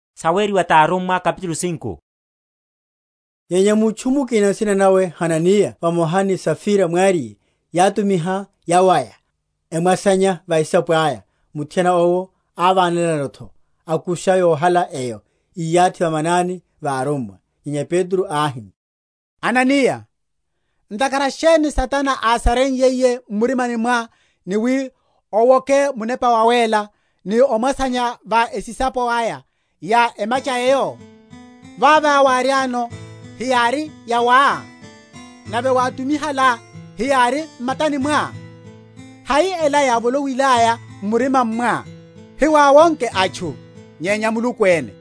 Sa Hananiya ni Safira. Nyenya mutchu mukina nsina nawe Hananiya vamoha ni Safira mwariye, yátumiha yawaya, amwasanya va esisapo aya, muthiana owo ávánelano’tho, akusha yohala eyo, íyathi va manani va arummwa. Nyenya Petro áhi, Hananiya, ntakhara sheni Satana ásareiyiye m’murimani mwá ni wi owoke Munepa Wawéla, ni omwasanya va esisapo aya ya emacha eyo? Vava wáriáno, heyári yawá? nave wátumihalá heyári m’matani mwá? hai ela yávoloiyaya m’murimani mwá? hiwáwonke atchu, nyenya Muluku ene.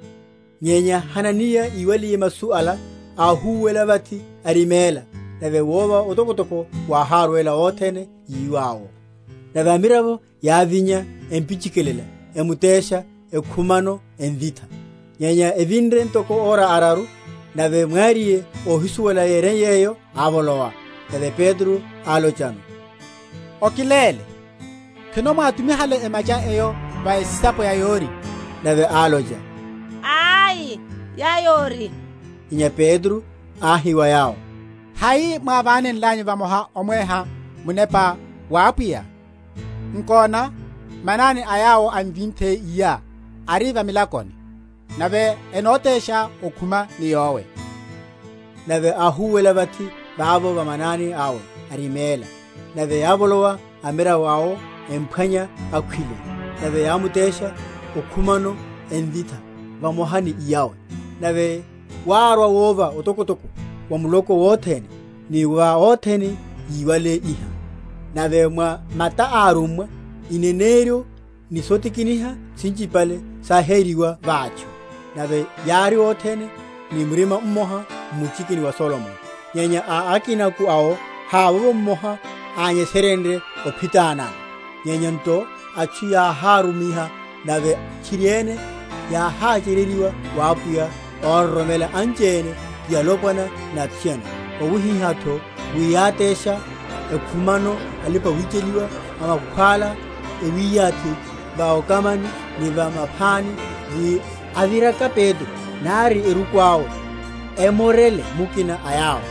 Nyenya Hananiya íwaliye masu ala áhúwela vathi ariméla: nave wova otokotoko wáhárwela othene yíwa’wo. Nave amiravo yávinya, empichikilela, emutesha, ekhumano, emvitha. Nyenya evinre ntoko ora araru, nave mwariye, óhisuwela yereiye’yo, ávolowa. Nave Petro álochano, Okiléle, khwino mwátumihale emacha eyo va esisapo ya yori. Nave álocha, Ai, ya yori. Nyenya Petro áhi wa yowo, Hai mwávánenlanyu vamoha omweha Munepa wa Apwiya? Nkona, manani a yawo emvinthe iyá ari va milakoni, nave enotesha okhuma ni yowe. Nave áhúwela vathi vavo va manani awe, ariméla: nave yávolowa amiravo awo, emphwanya akhwile, nave yámutesha okhumano, emvitha vamoha ni iyawe. Nave wárwa wova otokotoko wa muloko wothene, ni va othene yíwale iha. Nave mwa mata a arummwa ineneryo ni sotikiniha sinchipale sáhériwa va atchu; nave yári othene ni murima mmoha m’muchiki wa Solomoni. Nyenya a akinako awo havovo mmoha ányeserenrye ophitanano; nyenya nto atchu yáhárumiha; nave tchiriene yáháchereryiwa wa Apwiya óroromela anchipale, ti alopwana ni athiana; wawihiha’tho wi yátésha ekhumano alipa‐wicheliwa o makhwála, ewiyathi va okamani ni va maphani, wi, aviraka Petro, nari eruku awe emmorele mukina a yawo.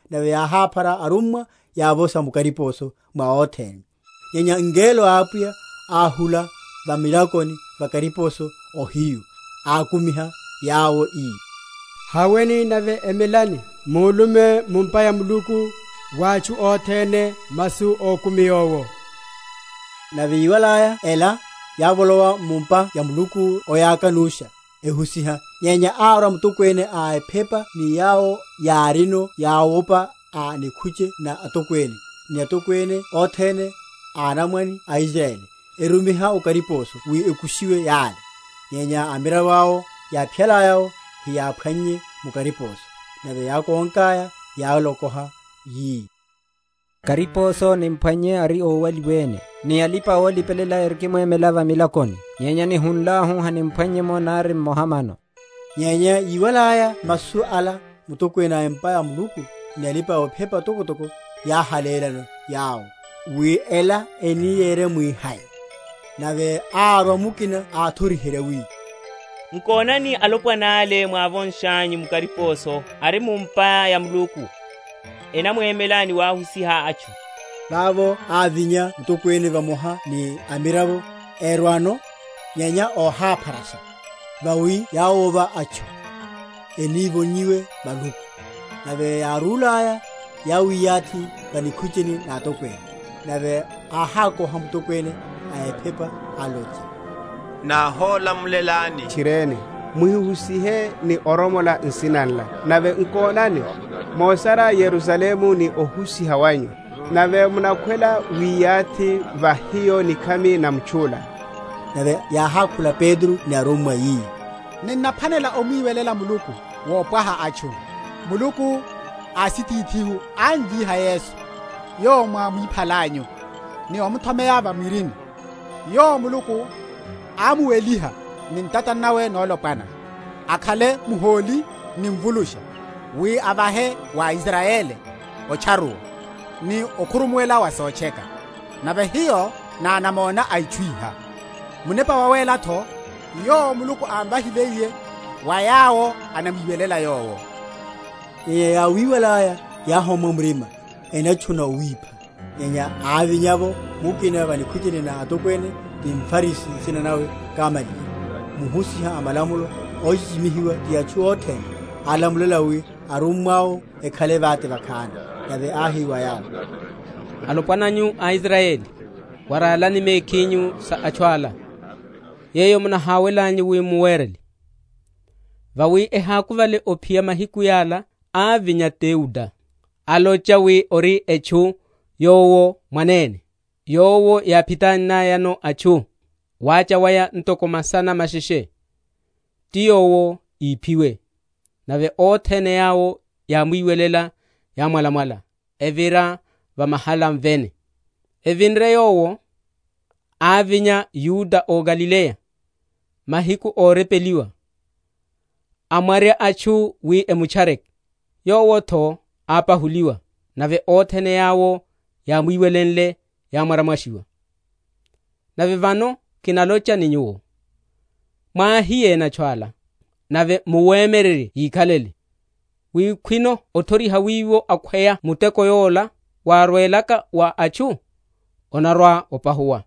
nave yáháphara arummwa, yávosha mu kariposo mwa othene. Nyenya ngelo a Apwiya áhula va milakoni va kariposo ohiyu, ákumiha yawo, ii, Haweni, nave emelani, mulume mu’mpa ya Muluku wa atchu othene masu a okumi yowo. Nave yiwalaya ela, yávolowa mu’mpa ya Muluku oyaka‐nusha, ehusiha. Nyenya árwa mutokwene a ephepa ni yawo yárino yáwopa a nikhuche na atokwene, ni atokwene othene a anamwane a Israyeli, erumiha o kariposo wi ekushiwe yale. Nyenya amiravo awo yáphiyalaya’wo hiyáphwannye mu kariposo, nave yákonkaya yálokoha, yi, Kariposo nimphwannye ari ówaliwene, ni alipa‐olipelela erikimwemela va milakoni; nyenya nihunlahu haniphwannye’mo nari mmoha mano. Nyenya yíwalaya masu ala mutokwene a’mpa ya Muluku ni alipa‐ephepa atokotoko yáhalélano yawo, wi ela eni yeremwihai. Nave árwa mukina áthoriherya, wi, Nkonani, alopwana’le mwávonshanyu mu kariposo ari mu’mpa ya Muluku, enamwemela ni wahusiha atchu. Vavo ávinya mutokwene vamoha ni amiravo; erwano, nyenya óhápharasha, vawi yáwova atchu, enívonyiwe maluku. Nave yárúhalaya, yáwiyathi va nikhucheni na atokwene. Nave áhákoha mutokwene a ephepa, alocha, Náholamulelani tchiriene, muhihusihe ni oromola nsina nla; nave nkonani, mosarya Yerusalemu ni ohusiha wanyu, nave munakhwela wiyathi va hiyo nikhami na mutchu’la. Nave yáhákhula Petro ni arummwa, yi, Ninnaphwanela omwiwelela Muluku wopwaha atchu. Muluku ásitithihu ámvíha Yesu, yowo mwámwiphalanyu, ni omuthomeya va mwirini. Yowo Muluku ámuweliha ni ntata nawe nolopwana, akhale Muhóli ni Mvulusha, wi ávahe wa Israyeli otcharuwa, ni okhurumuwela wa sotcheka. Nave hiyo ná anamona a itchu iha; Munepa Wawéla’tho, yowo Muluku ámvahiliye wa yawo anamwiwelela Yowo. Nyenya yáwíwalaya yáhommwa murima, enatchuna owipha. Nyenya ávinya’vo mukina va nikhucheni na atokwene, ti mFarisi, nsina nawe Gamaliyeli, muhusiha a malamulo, óchichimihiwa ti atchu othene, alamulela wi arummwa’wo ekhale vate vakhani. Nave áhi wa yawo, Alopwana nyu a Israyeli, waralani mekhinyu sa atchu ala, yeyo munaháwelanyu wi muwerele. Vawi ehákuvale ophiya mahiku yala ávinya Teuda, alocha wi ori etchu yowo mwanene; yowo yáphitannayano atchu, wacha waya ntoko masana masheshe: ti yowo íphiwe; nave othene yawo yámwiwelenle yámwalamwala, evira va mahalani vene. Avinre yowo, ávinya Yuda ó Galileya, mahiku órepeliwa, amwarya atchu wi emutchare. Yowo’tho ápahuliwa, nave othene yawo yámwiwelenle yámwaramwashiwa. Nave vano kinalocha ni nyuwo, Mwáhiyéni atchu yala, nave muwemyererye yíkhalele; wi khwino othoriha wiwo akhweya muteko yola wárwelaka wa atchu, onarwa‐opahuwa: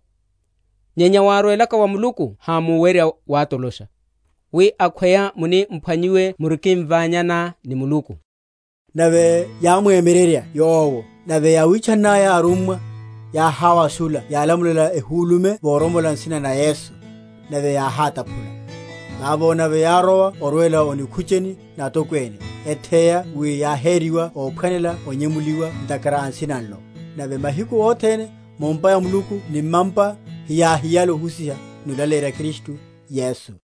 nyenya wárwelaka wa Muluku hamuwerya watolosha; wi akhweya muni m’phwanyiwe muriki?-?mvanyana ni Muluku. Nave yámwemyererya yowo; nave yáwitchannaya arummwa, yáháwashula yalamulela ehulume voromola nsina na Yesu, nave yáhátaphula. Vavo nave yárowa orwela o nikhucheni na atokwene, etheya wi yáheriwa óphwanela onyemuliwa ntakhara a Nsina nlo. Nave mahiku othene, mu’mpa ya Muluku ni mma’mpa, hiyáhiyale ohusiha ni olaleyerya Kristu Yesu.